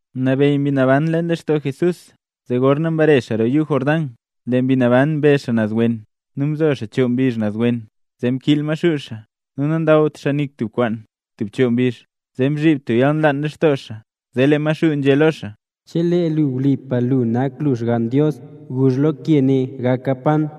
Mnabeyy Mbi Naban leen lextoo Jesús, zee gorna mbare xaa roo yuu Jordán, lee Mbi Naban mbe xaa naz wen. Nu mzo xaa choo mbizh naz wen zee mkiil Maxuu xaa, nu nandawt xaa nik tub kwaan tub choo mbizh, zee mzhiib tub yalnlaan lextoo xaa. Zee lee Maxuu nzhé lo xaa: —Chelee lu wlipa lu nak lu Xgann Dios, guzh lo ke ne gaka pan.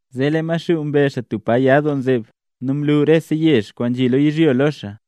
Zee lee Maxuu mbe xaa tub pa ya doo nzeb, nu mlu rese yezh kwaan nzhi lo yizhyo lo xaa.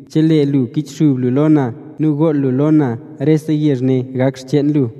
Chelee lu kichxub lu lo na nu gool lu lo na rese yezh ne gak xcheen lu.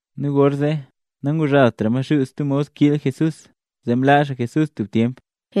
Nu gorzee nanguzhaaltra Maxuu stub mod kiil Jesús, zee mlaa xaa Jesús tub tyemp.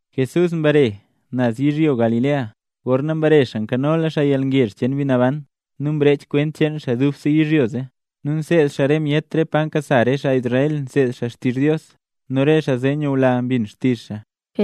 Jesús mbare naz yizhyo Galilea, gorna mbare xaa nkanola xaa yalngezh cheen Mbi Naban nu mrech kwent cheen xaa dubse yizhyo zee. Nu nseed xaa re myet re pa nkasa xaa Israel nseed xaa xtizh Dios, nu re xaa zee nyula mbin xtizh xaa.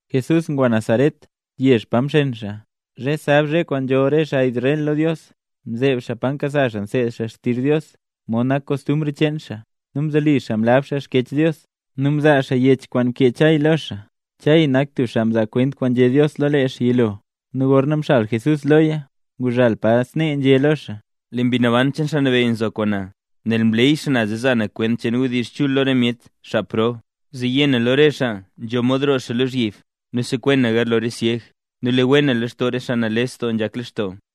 Jesús ngwa Nazaret, yezh pa mxen xaa. Zhe sab, zhe kwaan nzholl re xaa Israel lo Dios, mzeeb xaa pa nkasa xaa nseed xaa xtizh Dios, mod nak kostumbr cheen xaa; nu mzoli xaa mlab xaa Xkyech Dios. Nu mzaa xaa yech kwaan mkee Chay lo xaa; Chay nak tub xaa mzaa kwent kwaan nzhé Dios lo lee xaa yilo. Nu gorna mxal Jesús loya, nguzhal pa nzhé snee lo xaa: Lee Mbi Naban cheen Xaa Nabeyy nzo kwaan na, nel mleey xaa na zee za na kwent cheen wdizh chul lo re myet xaa prob; zee yé na lo re xaa nzho mod roo xaa lozhyib; nu sekwen na garlo re syeg; nu le wen na lextoo re xaa nales doo nzhak lextoo;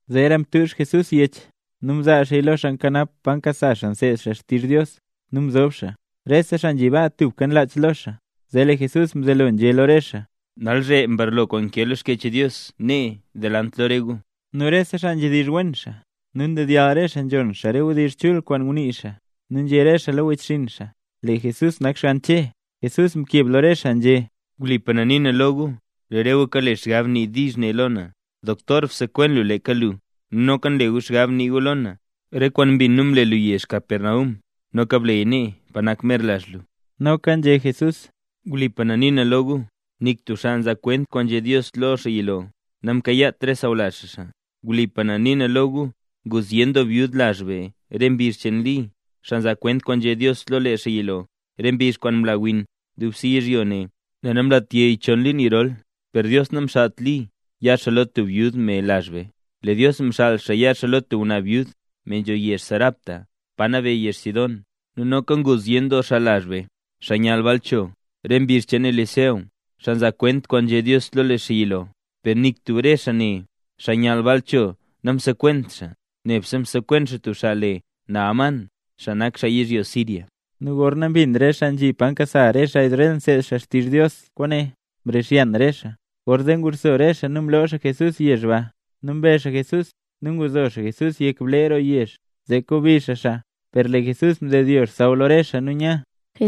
Zeera mtuuzh Jesús yech, nu mzaa xaaya lo xaa nkanap pa nkasa re xaa nseed xaa xtizh Dios, nu mzob xaa. Rese xaa nzhi baa tubka nlach lo xaa. Zee lee Jesús mzelo nzhé lo re xaa: —Nalzhe mbarlo kwaan nkee lo Xkyech Dios nee, delant lo re gu. Nu rese xaa nzhedizh wen xaa, nu ndedyall re xaa nzhon re wdizh chul kwaan ngunii xaa, nu nzhé re xaa lo wechxinn xaa: —¡Lee Jesús nak xgann Che! Jesús mkeb lo re xaa nzhé: —Wlipa na nii na lo gu, lee re gu kale xgab nii diizh ne lo na: “Doktor bsekwen lu leeka lu”. Nu noka nle gu xgab nii gu lo na: “Re kwaan mbin nu mle lu yezh Capernaum, noka bleya nee, pa nak mer lazh lu”. Noka nzhé Jesús: —Wlipa na nii na lo gu, nik tub xaa mzaa kwent kwaan nzhé Dios lo xaa yilo, namkayaawent re sawlazh xaa xaa. Wlipa na nii na lo gu, ngu zyen doo byud lazh be re mbizh cheen Li, xaa mzaa kwent kwaan nzhé Dios lo lee xaa yilo, re mbizh kwaan mla win dubse yizhyo ne nel namlat yey chon liin yirol. Per Dios namxaalt Li ya xaa lo tub byud me lazh be, lee Dios mxaal xaa ya xaa lo tub ngwnaa byud, me nzho yezh Sarepta, pa nabeyy yezh Sidón. Nu noka ngu zyen doo xaa lazh be, xaa myall baal cho, re mbizh cheen Eliseo, xaa mzaa kwent kwaan nzhé Dios lo lee xaa yilo, per nik tub re xaa ne, xaa myall baal cho namsekwent xaa, nebse msekwen xaa tub xaa le Naamán, xaa nak xaa yizhyo Siria. Nu gorna mbin re xaa nzhi pa nkasa xaa Israel nseed xaa xtizh Dios kwaane, mrixyan re xaa. Gorzee nguxso re xaa nu mloo xaa Jesús yezh ba, nu mbe xaa Jesús nu nguzo xaa Jesús yek blee roo yezh, zee kobi xaa xaa. Per lee Jesús mdedyo xsaww lo re xaa nu nya.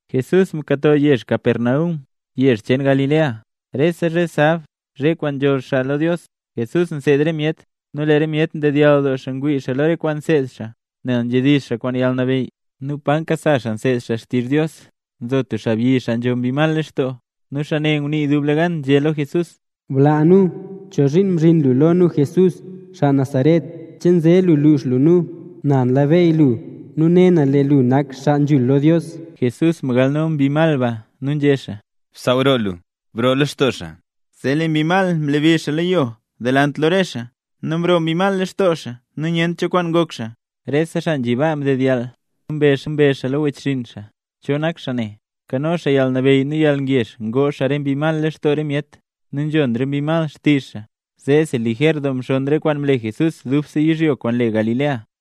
Jesús mkato yezh Capernaum, yezh cheen Galilea. Rese zhe sab, zhe kwaan nzholl xaa lo Dios, Jesús nseed re myet. Nu lee re myet ndedyall doo ngwii lo re kwaan nseed xaa, nel nzhedizh xaa kwaan yalnabeyy. Nu pa nkasa xaa nseed xaa xtizh Dios, nzo tub xaabyi xaa nzho mbi mal lextoo, nu xaa ne ngunii dublegan, nzhé lo Jesús: —¡Blaa nu! ¿Chozhiin mzhin lu lo nu Jesús, xaa Nazaret? ¿Che nze lu lux lu nu? Na nlabeyy lu, nu ne na lee lu nak Xaa Nzhul lo Dios. Jesús mgalno mbi mal ba, nu nzhé xaa: —¡Bsaaw roo lu! ¡Broo lextoo xaabyi ne! Zee lee mbi mal mlebi xaa lo yo delant lo re xaa, nu mroo mbi mal lextoo xaa nu nyent cho kwaan ngok xaa. Rese xaa nzhi baa mdedyall, nu mbezh xaa lo wechxinn xaa: —¿Cho nak xaa ne? Nkano xaa yalnabeyy nu yalngezh ngoo xaa re mbi mal lextoo re myet, nu nzhon re mbi mal xtizh xaa. Zeesi, lijer doo mxonn re kwaan mle Jesús dubse yizhyo kwaan le Galilea.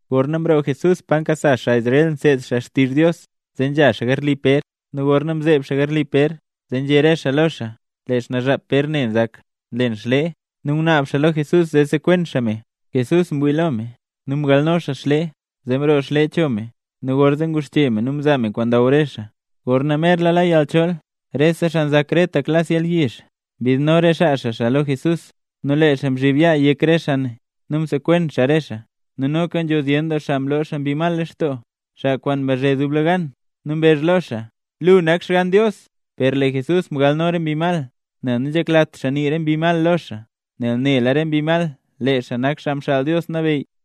Gorna mroo Jesús pa nkasa xaa Israel nseed xaa xtizh Dios, zee nzha xaa garli Pér. Nu gorna mzeeb xaa garli Pér, zee nzhé re xaa lo xaa lee xnaazhap Pér ne nzak, nlen xlee, nu ngunaab xaa lo Jesús zee sekwen xaa me. Jesús mwii lo me, nu mgalno xaa xlee, zee mroo xlee cho me. Nu gorzee nguxche me nu mzaa me kwaan ndaw re xaa. Gorna merla la yalchool, rese xaa nzak rete klas yalyizh mbidno re xaa xaa lo Jesús nu lee xaa mzhib yaa yek re xaa nu msekwen xaa re xaa. Nu noka nzho zyen doo xaa mloo xaa mbi mal lextoo, xaa kwaan mbazhe dublegan nu mbezh lo xaa: —¡Lu nak Xgann Dios! Per lee Jesús mgalno re mbi mal nel nanzheklat xaa nii re mbi mal lo xaa, nel nela re mbi mal lee xaa nak Xaa Mxaal Dios Nabeyy.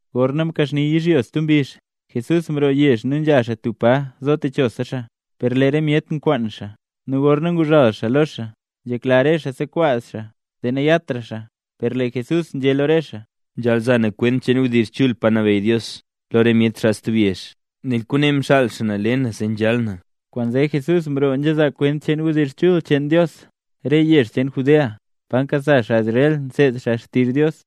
Gorna mkaxni yizhyo stub mbizh, Jesús mroo yezh nu nzha xaa tub pa zo techosa xaa. Per lee re myet nkwaan xaa, nu gorna nguzhal xaa lo re xaa, nzhekla re xaa sekwaz xaa, zee nayatra xaa. Per lee Jesús nzhé lo re xaa: —Nzhaal za na kwent cheen wdizh chul cheen Pa Nabeyy Dios lo re myet xaa stub yezh, nel kwaane mxaal xaa na le na zee nzhal na. Kwaanzee Jesús mroo nzhazaa kwent cheen wdizh chul cheen Dios re yezh cheen Judea, pa nkasa xaa Israel nseed xaa xtizh Dios.